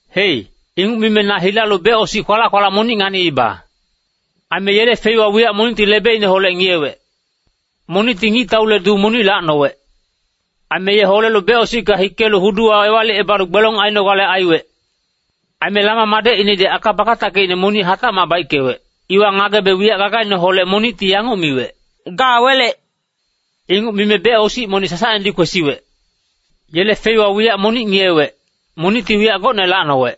Hei, inguc mime na hilalu becosic kwalac-kwalac monic nganiiba. Aime yele feiwa wiyac monicti lebeineholec ngiyewec. Monicti ngictaule duu monic lacnowec. Aime ye holelu becosicka hikelu huduwa ewalicebalu gbelong ainogale aiwec. Aime Lama madecinedi aka bakatackeicne monic hatacmac baickewec, iwa ngagebe wiyac gagaineholec monicti yanguc miwec, “Ga welec!” Inguc mime becosic monic sasacnedi kwesiwec. Yele feiwa wiyac monic ngiyewec, monicti wiyac gocne lacnowec.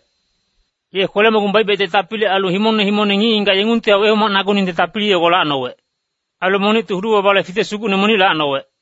Ye kwele-mogung baic-baicte tapili ailu himongne himongne ngic-ngigac yengungtihac wehomacnaguningte tapili yogo lacnowec. Ailu monicti hudu-babale fitec sugucne monic lacnowec.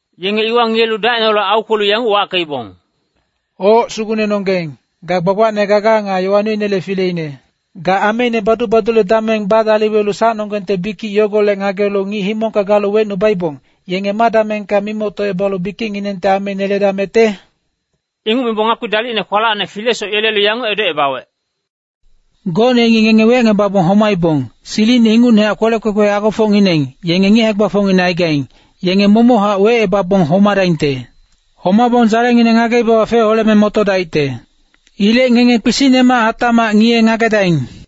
Yenge iwa ngiyelu dacineholec aukwelu yanguc wackeibong, “Oc, Sugucnenonggeng, ga gbagbacne gaga nga yowa noinele fileine. Ga ameine badu-badule dameng badaliwelu sacnonggengte bikic yogolec ngagelu ngic himongka galu wecnubaibong, yenge ma damengka mimoctocebalu bikicnginengte ameine yeledamecte?” Inguc mibong ngakpi dalicne kwalacne filesoc yelelu yanguc edocebawec, “Gocne yengi ngenge wecngebabong homaibong, silicine ingucnehac kwelec kwekwe agofocngineng, yenge ngic hae-gbafocngineng aigaing, yenge momochac wecebabong homadaingte. Homabong dzalengineng ngageibawa feholeme motodaicte. Ilec ngenge kpisicnemac hatacmac ngiye-ngagedaing.”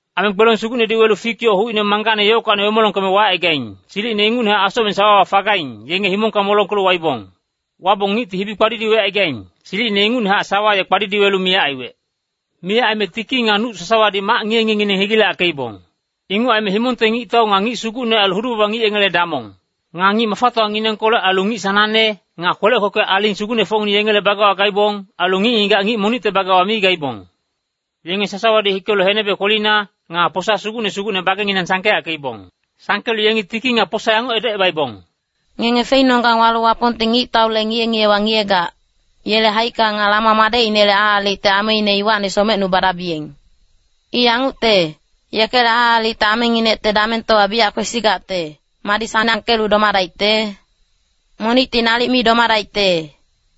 Aime gbelong sugucnedi welu fik yoc hucine manggangne yockacni wemolongkeme wacaigaing, silicine ingucnehac asocmeng sawawa fagaing, yenge himongka molongkelu waibong. Wabong ngicti hibi kpadidiwecaigaing, silicine ingucnehac sawa ye kpadidiwelu miyac aiwec. Miyac aime tiki nga nuc sasawadi mac ngiye-ngiyengineng hegileyackeibong. Inguc aime himongte ngictau nga ngic sugucne ailu hudu-baba ngic yengele damong. Nga ngic mafatowanginengkolec ailu ngic sanangne, nga kwelec kwekwe aling sugucnefocngineng yengele bagewa gaibong, ailu ngic-ngigac ngic monicte bagewa mi gaibong. Yenge sasawadi hikelu henebe kwelina, nga posa sugucne sugucne bagenginang sangkeyackeibong. Sangkelu yengi tiki nga posa yanguc edocebaibong, “Ngenge feinonggang walu Wapongti ngictaule ngiye-ngiyewa ngiyegac, yele haicka nga Lama madecinele aalicte ameine iwacni somecnubadabiyeng. I yangucte, yekele aalicte amenginecte damengtowa biyac kwesigacte, madi sanangkelu domadaicte? Monicti nalic mi domadaicte!”